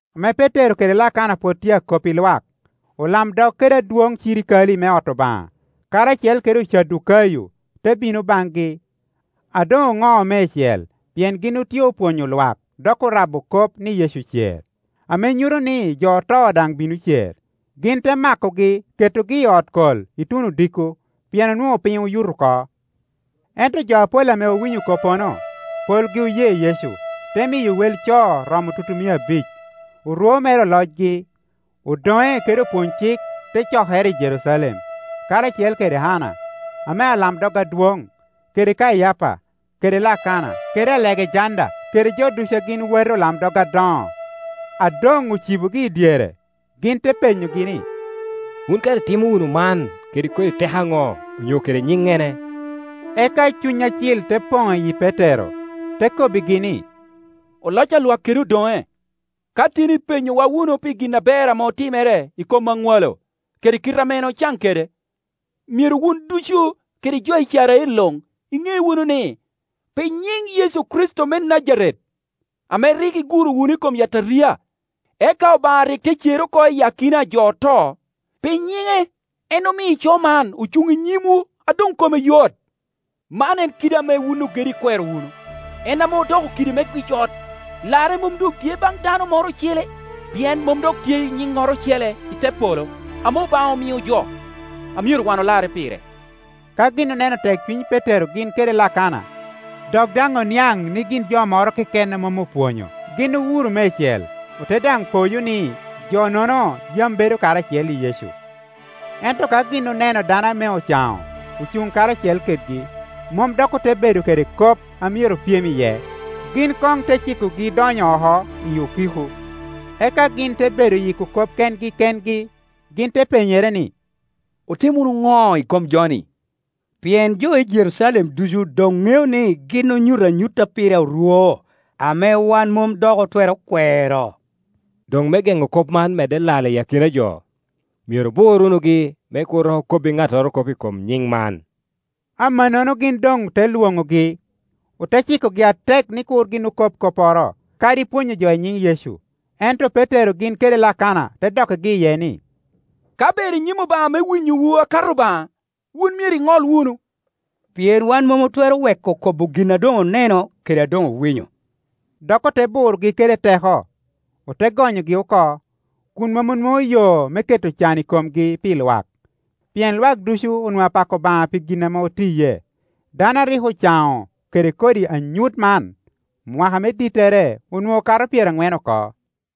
Ame Petero kede Lakana pwod tye akop i lwak, olamdog kede adwoŋ cirikale me ot Obaŋa, karacel kede Ocadukayo, te bino baŋgi, a doŋ oŋo meicel pien gin otye opwonyo lwak dok orabo kop ni Yecu ocer, ame nyuto ni jo oto daŋ bino cer. Gin te makogi ketogi i ot kol ituno odiko, pien onwoŋo piny oyuto oko. Ento jo apol ame owinyo koppono, polgi oye Yecu, te miyo wel co romo tutumia abic. Orwo mere olocgi, odoŋe kede opwony-cik te cokere i Jerucalem, karacel kede Anna, ame alamdog adwoŋ, kede Kayapa, kede Lakana, kede Alegejanda, kede jo ducu a gin wati olamdog adoŋo. A doŋocibogi i dyere, gin te penyogi ni, “Wun kara itimo wunu man kede kodi teko aŋo onyo kede nyiŋŋene?” Eka Cuny acil te poŋ i yi Petero, te kobbigi ni, “Oloc a lwak kede odoŋe, ka tin ipenyowa wunu pi gin aber ame otimere i kom aŋwalo kede kite ame en ocaŋ kede, myero wun ducu, kede jo Icrael luŋ, iŋe wunu ni, pi nyiŋ Yecu Kricito me Najaret ame rik iguro wunu i kom yataria, eka Obaŋa rik te cere oko iyi akina a jo oto, pi nyiŋe en omio ico man ocuŋ inyimwu a doŋkome yot. Man en kidi ame wun ogedo ikwero wunu, en ame odoko kidi me gwic ot. Larre mom doŋtye baŋ dano moro ocele; pien mom dok tye nyiŋŋoro ocele i te polo ame Obaŋa omio jo, a myero wan olarre pire.” Ka gin oneno tekcuny Petero gin kede Lakana, dok daŋ oniaŋ ni gin jo moro keken a mom opwonyo, gin owuro meicel, ote daŋ poyo ni jo-nono yam bedo karacel i Yecu. Ento ka gin oneno dano ame ocaŋo ocuŋ karacel kedgi, mom doŋote bedo kede kop a myero opyem iye. Gin koŋ te cikogi donyo oko i okiko, eka gin te bedo yiko kop kengi kengi. Gin te penyere ni, “Otim wunu ŋo i kom jo-ni? Pien jo i Jerucalem ducu doŋ ŋeo ni gin onyuto anyut a pire orwo, ame wan mom dok otwero kwero. Doŋ me geŋo kop man medde lal i akina a jo, myero obur wunugi me kur dok okobbi ŋattoro kop i kom nyiŋ man.” Amannono gin doŋ te lwoŋogi, ote cikogi atek ni kur gin okob kopporo, kadi pwonyo jo i nyiŋ Yecu. Ento Petero gin kede Lakana te dokkigi iye ni, “Ka ber i nyim Obaŋa me winyowu akato Obaŋa, wun myero iŋol wunu; pien wan mom otwero weko kobo gin a doŋ oneno kede a doŋowinyo.” Dok ote burogi kede teko, ote gonyogi oko, kun mom onwoŋo yo me keto can i komgi pi lwak; pien lwak ducu onwoŋo apako Obaŋa pi gin ame otiye. Dano a rik ocaŋo kede kodi anyut man, mwaka me dittere onwoŋo kato pyeraŋwen oko.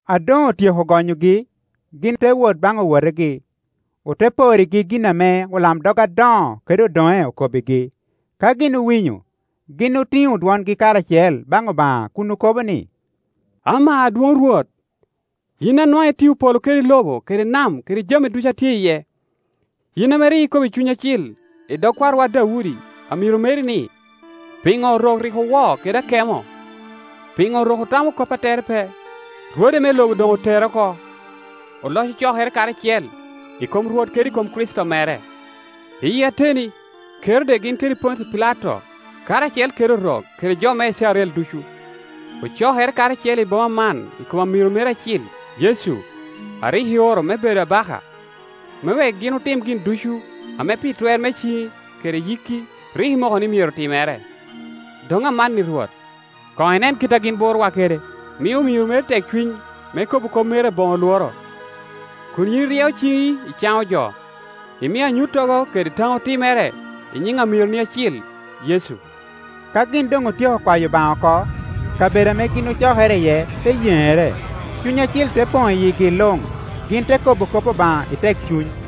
A doŋ otyeko gonyogi, gin te wot baŋ owotegi, ote porrigi gin ame olamdog adoŋo kede odoŋe okobbigi. Ka gin owinyo, gin otiŋo dwongi karacel baŋ Obaŋa kun okobo ni, “Ama Adwoŋ Rwot, yin a nwaŋ itio polo kede lobo kede nam kede jami ducu a tye iye. Yin ame rik ikobo i Cuny Acil i dog kwarowa Daudi, amiro meri ni, ‘Piŋo Orok rik owo kede akemo? Piŋo rok otamo kop a tere pe? Rwode me lobo doŋ oterre oko, oloc ocokere karacel, i kom Rwot kede i kom Kricito mere.’ Iyi ateni, Kerode gin kede Pontio Pilato, karacel kede Orok kede jo me Icrael ducu, ocokere karacel i boma man i kom amiro meri acil, Yecu, a rik ioro me bedo abaka, me wek gin otim gin ducu ame pi twer me ciŋi kede yikki rik imoko ni myero timere. Doŋ amanni Rwot, koŋ inen kit a gin burowa kede, mi omiro meri tekcuny me kobo kop meri aboŋo lworo, kun yin iryeo ciŋi icaŋo jo, imio anyuttogo kede taŋo timere i nyiŋ amironi acil, Yecu.” Ka gin doŋ otyeko kwayo Obaŋa oko, kabedo ame gin ocokere iye te yeŋere, Cuny Acil te poŋ i yigi luŋ, gin te kobo kop Obaŋa i tekcuny.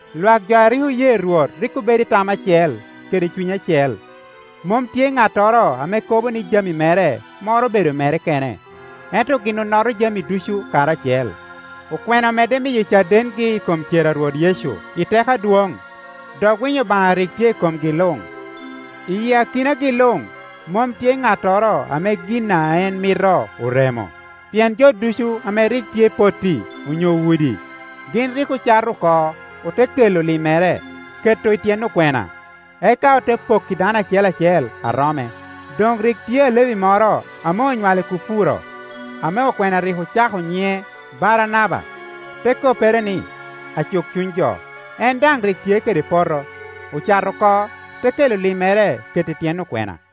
Lwak jo a rik oye Rwot rik obedo i tam acel kede cuny acel; mom tye ŋattoro ame kobo ni jami mere moro obedo mere kene, ento gin onoto jami ducu karacel. Okwena omedde miyo cadengi i kom cer a Rwot Yecu i teko adwoŋ, dok winyo Obaŋa rik tye i komgi luŋ. Iyi akinagi luŋ, mom tye ŋattoro ame gin a en mito oremo, pien jo ducu ame rik tye i potti, onyo udi, gin rik ocato oko ote kelo limmere, keto i tyen okwena; eka ote pokki dano acel acel a rome. Doŋ rik tye Alevi moro ame onywalo i Kupuro, ame okwena rik ocako nyiŋe Baranaba, te koppere ni, Acuk cuny jo. En daŋ rik tye kede poto, ocato oko, te kela limmere keto i tyen okwena.